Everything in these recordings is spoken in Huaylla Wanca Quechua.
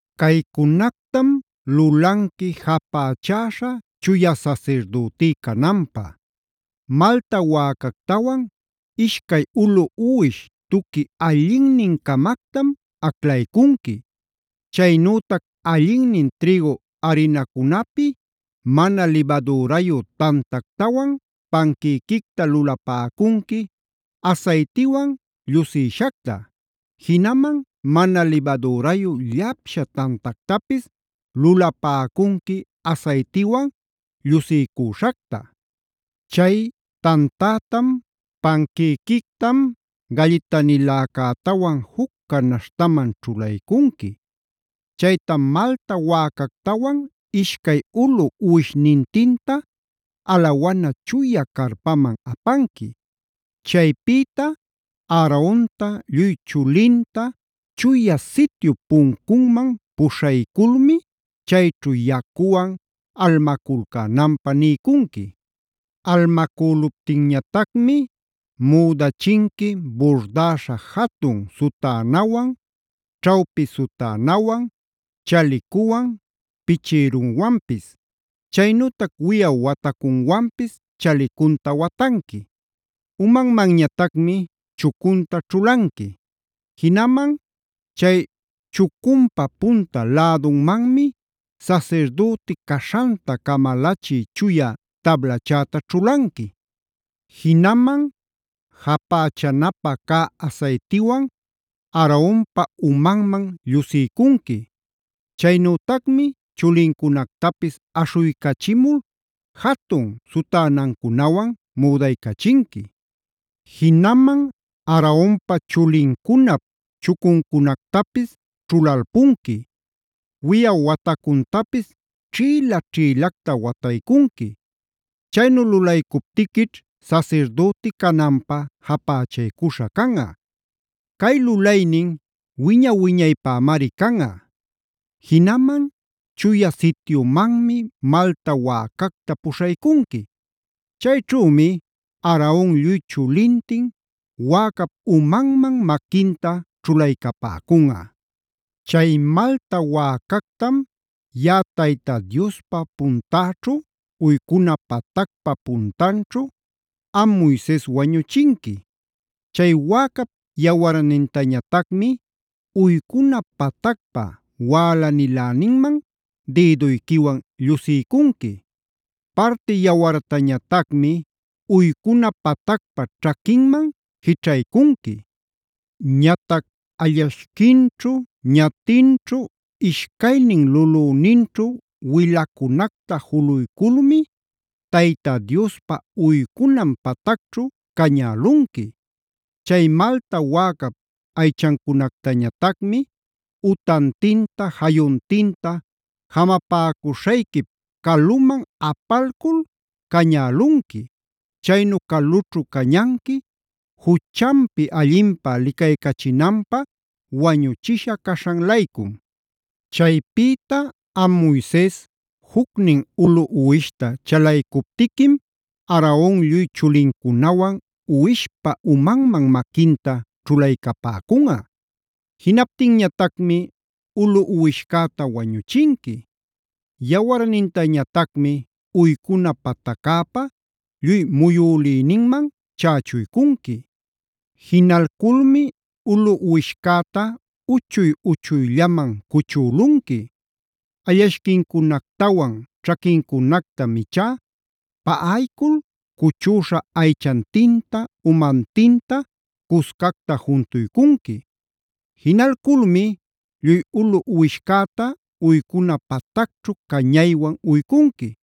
“Caycunactam lulanqui japächäśha chuya sasirdütí cananpä: malta wäcactawan, ishcay ulu uwish tuqui allinnin-camactam aclaycunqui. Chaynütac allinnin trïgu arinacunapi mana libadürayu tantactawan panquïquicta lulapäcunqui asaytiwan llusïshacta. Jinaman mana libadürayu llapsha tantactapis lulapäcunqui asaytiwan llusiycüśhacta. Chay tantätam, panquïquitam, gallitaniläcätawan juc canaśhtaman ćhulaycunqui. Chaytam malta wäcactawan ishcay ulu uwishnintinta alawana chuya carpaman apanqui. Chaypïta Aaronta lluy chulinta Chuya Sityup puncunman puśhayculmi chayćhu yacuwan almaculcänanpä niycunqui. Almacüluptinñatacmi müdachinqui burdäśha jatun sutänawan, ćhawpi sutänawan, chalicuwan, pichïruwanpis. Chaynütac wiyaw watacunwanpis chalicunta watanqui. Umanmanñatacmi chucunta ćhulanqui. Jinaman chay chucunpa punta lädunmanmi sasirdüti caśhanta camalachï chuya tablachäta ćhulanqui. Jinaman japächanapä cä asaytiwan Aaronpa umanman llusiycunqui. Chaynütacmi chulincunactapis aśhuycachimul, jatun sutänancunawan müdaycachinqui. Jinaman Aaronpa chulincunap chucuncunactapis ćhulalpunqui, wiyaw watacuntapis ćhïla-ćhïlacta wataycunqui. Chaynu lulaycuptiquićh sasirdüti cananpä japächaycuśha canꞌa. Cay lulaynin wiña-wiñaypämari canꞌa. “Jinaman Chuya Sityumanmi malta wäcacta puśhaycunqui. Chayćhümi Aaron lluy chulintin wäcap umanmana maquinta ćhulaycapäcunꞌa. Chay malta wäcactam yaꞌa Tayta Diospa puntäćhu, uycuna patacpa puntanćhu am Moises wañuchinqui. Chay wäcap yawarnintañatacmi uycuna patacpa wälaniläninman dïduyquiwan llusiycunqui. Parti yawartañatacmi uycuna patacpa ćhaquinman jićhaycunqui. Ñatac allashquinćhu, ñatinćhu, ishcaynin lulüninćhu wilacunacta juluyculmi Tayta Diospa uycunan patacćhu cañälunqui. Chay malta wäcap aychancunactañatacmi utantinta, jayuntinta jamapäcuśhayquip caluman apalcul cañälunqui. Chaynu calućhu cañanqui juchanpi allinpä licaycachinanpä wañuchisha caśhan-laycum. “Chaypïta am Moises, jucnin ulu uwishta chalaycuptiquim Aaron lluy chulincunawan uwishpa umanman maquinta ćhulaycapäcunꞌa. Jinaptinñatacmi ulu uwishcäta wañuchinqui. Yawarnintañatacmi uycuna pataccäpa lluy muyülïninman chächuycunqui. Jinalculmi ulu uwishcäta uchuy-uchuyllaman cuchülunqui. Allashquincunactawan ćhaquincunactam ichá paꞌaycul cuchüśha aychantinta, umantinta cuscacta juntuycunqui. Jinalculmi lluy ulu uwishcäta uycuna patacćhu cañaywan uycunqui.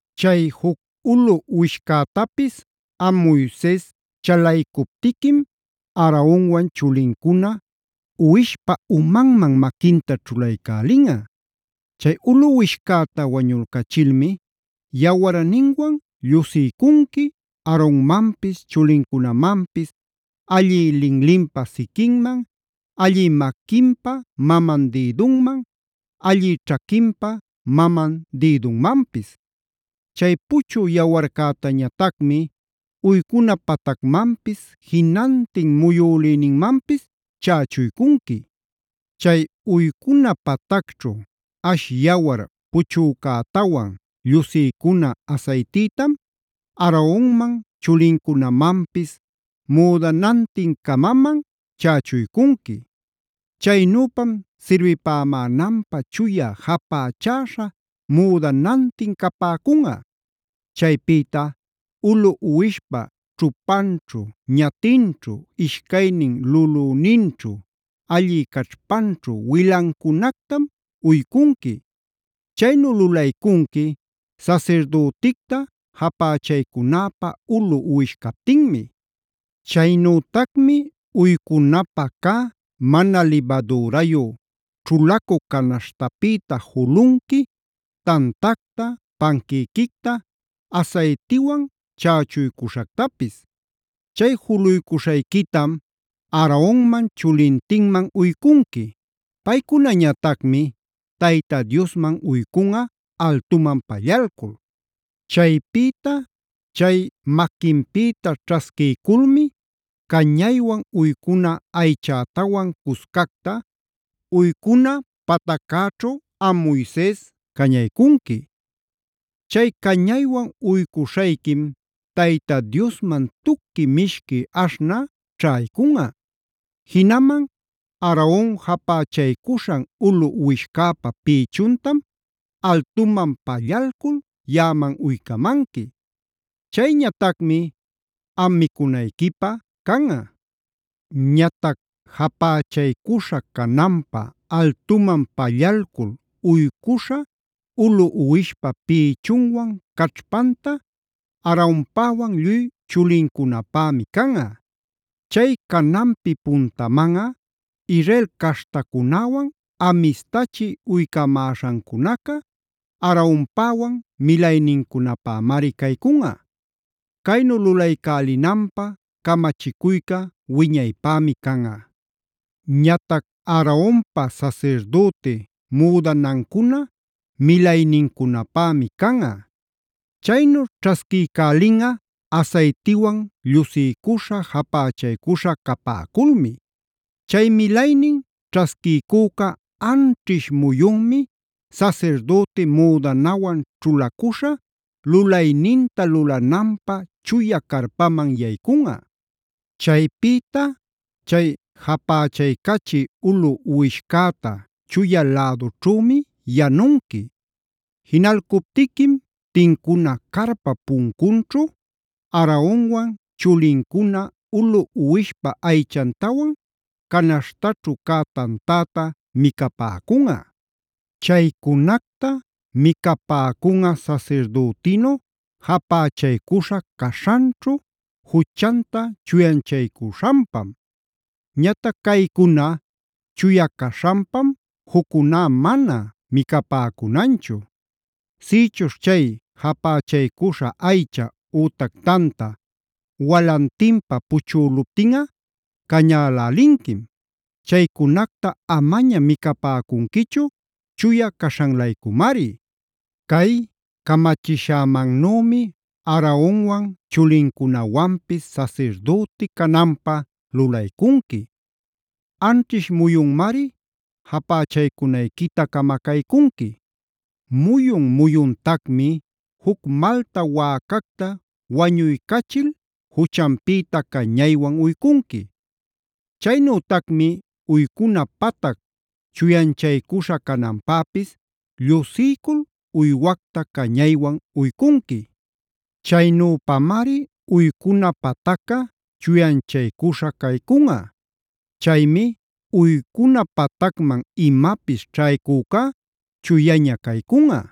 “Chay juc ulu uwishcätapis am Moises chalaycuptiquim Aaronwan chulincuna uwishpa umanman maquinta ćhulaycälinꞌa. Chay ulu uwishcäta wañulcachilmi yawarninwan llusiycunqui Aaronmanpis chulincunamanpis allï linlinpa siquinman, allï maquinpa maman dïdunman, allï ćhaquinpa maman dïdunmanpis. Chay puchü yawarcätañatacmi uycuna patacmanpis, jinantin muyülïninmanpis chächuycunqui. Chay uycuna patacćhu ash yawar puchücätawan, llusiycuna asaytïtam Aaronman chulincunamanpis müdanantin-camaman chächuycunqui. Chaynüpam sirbipämänanpä chuya japächäśha müdanantin capäcunꞌa. “Chaypïta ulu uwishpa ćhupanćhu, ñatinćhu, ishcaynin lulunninćhu, allï caćhpanćhu wilancunactam uycunqui. Chaynu lulaycunqui sasirdüticta japächaycunäpä ulu uwish captinmi. Chaynütacmi uycunapä cä mana libadürayu ćhulacu canaśhtapïta julunqui tantacta, panquïquicta asaytiwan chächuycuśhactapis. Chay juluycuśhayquitam Aaronman chulintinman uycunqui. Paycunañatacmi Tayta Diosman uycunꞌa altuman pallalcul. Chaypïta chay maquinpïta ćhasquiyculmi cañaywan uycuna aychätawan cuscacta uycuna pataccäćhu am Moises cañaycunqui. Chay cañaywan uycuśhayquim Tayta Diosman tuqui mishqui aśhnä ćhaycunꞌa. “Jinaman Aaron japächaycuśhan ulu uwishcäpa pïchuntam altuman pallalcul yaꞌaman uycamanqui.c Chayñatacmi am micunayquipä canꞌa. Ñatac japächaycuśha cananpä altuman pallalcul uycuśha ulu uwishpa pïchunwan caćhpanta Aaronpäwan lluy chulincunapämi canꞌa. Chay cananpi puntamanꞌa Israel caśhtacunäwan amistachi uycamäśhancunaca Aaronpäwan milaynincunapämari caycunꞌa. Caynu lulaycälinanpä camachicuyca wiñaypämi canꞌa. “Ñatac Aaronpa sasirdüti müdanancuna milaynincunapämi canꞌa. Chaynu ćhasquiycälinꞌa asaytiwan llusiycuśha, japächaycuśha capäculmi. Chay milaynin ćhasquiycüca anćhish muyunmi sasirdüti müdanawan ćhulacuśha lulayninta lulananpä chuya carpaman yaycunꞌa. “Chaypïta chay japächaycachi ulu uwishcäta chuya lädućhümi yanunqui. Jinalcuptiquim tincuna carpap puncunćhu Aaronwan chulincuna ulu uwishpa aychantawan canaśhtaćhu cä tantäta micapäcunꞌa. Chaycunacta micapäcunꞌa sasirdütinu japächaycuśha caśhanćhu juchanta chuyanchaycuśhanpam. Ñatac caycuna chuya caśhanpam juccuná mana micapäcunanchu. Sïchuśh chay japächaycuśha aycha ütac tanta walantinpä puchüluptinꞌa cañälälinquim. Chaycunacta amaña micapäcunquichu chuya caśhan-laycumari. “Cay camachishämannümi Aaronwan chulincunawanpis sasirdüti cananpä lulaycunqui. Anćhish muyunmari japächaycunayquita camacaycunqui. Muyun-muyuntacmi juc malta wäcacta wañuycachil juchanpïta cañaywan uycunqui. Chaynütacmi uycuna patac chuyanchaycuśha cananpäpis llusiycul uywacta cañaywan uycunqui. Chaynüpamari uycuna patacca chuyanchaycuśha caycunꞌa. Chaymi uycuna patacman imapis ćhaycücá chuyaña caycunꞌa.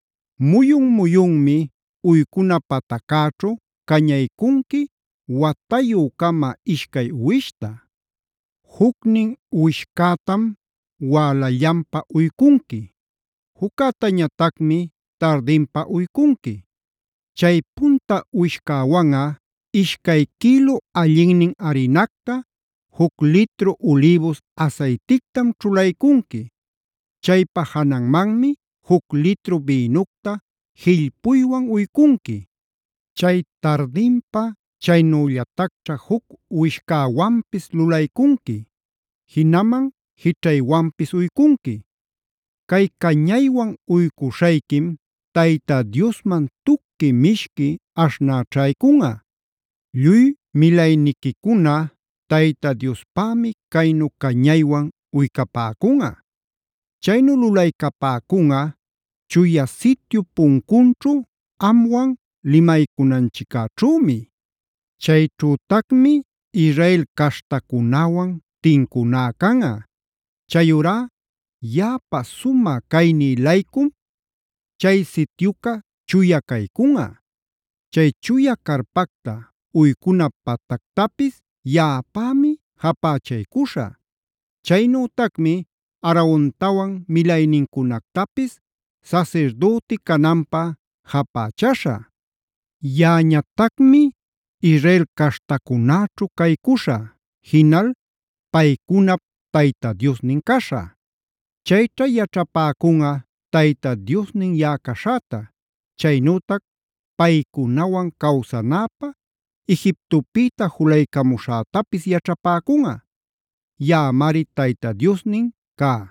“Muyun-muyunmi uycuna pataccäćhu cañaycunqui watayü-cama ishcay uwishta. Jucnin uwishcätam wälallanpa uycunqui. Juccätañatacmi tardinpa uycunqui. Chay punta uwishcäwanꞌa ishcay quïlu allinnin arinacta, juc litru ulïbus asaytictam ćhulaycunqui. Chaypa jananmanmi juc litru bïnucta jillpuywan uycunqui. Chay tardinpa chaynüllatacćha juc uwishcäwanpis lulaycunqui, jinaman jićhaywanpis uycunqui. Cay cañaywan uycuśhayquim Tayta Diosman tuqui mishqui aśhnä ćhaycunꞌa. “Lluy milayniquicuna Tayta Diospämi caynu cañaywan uycapäcunꞌa. Chaynu lulaycapäcunꞌa Chuya Sityup puncunćhu amwan limaycunanchiccäćhümi. Chayćhütacmi Israel caśhtacunäwan tincuná canꞌa. Chayurá yaꞌapa sumä cayní-laycum chay sityuca chuya caycunꞌa. Chay chuya carpacta, uycuna patactapis yaꞌapämi japächaycuśhä. Chaynütacmi Aarontawan milaynincunactapis sasirdüti cananpä japächaśhä. Yaꞌañatacmi Israel caśhtacunäćhu caycuśhä; jinal paycunap Tayta Diosnin caśhä. Chayćha yaćhapäcunꞌa Tayta Diosnin yaꞌa caśhäta. Chaynütac paycunawan cawsanäpä Egiptopïta julaycamüśhätapis yaćhapäcunꞌa. Yaꞌamari Tayta Diosnin cá.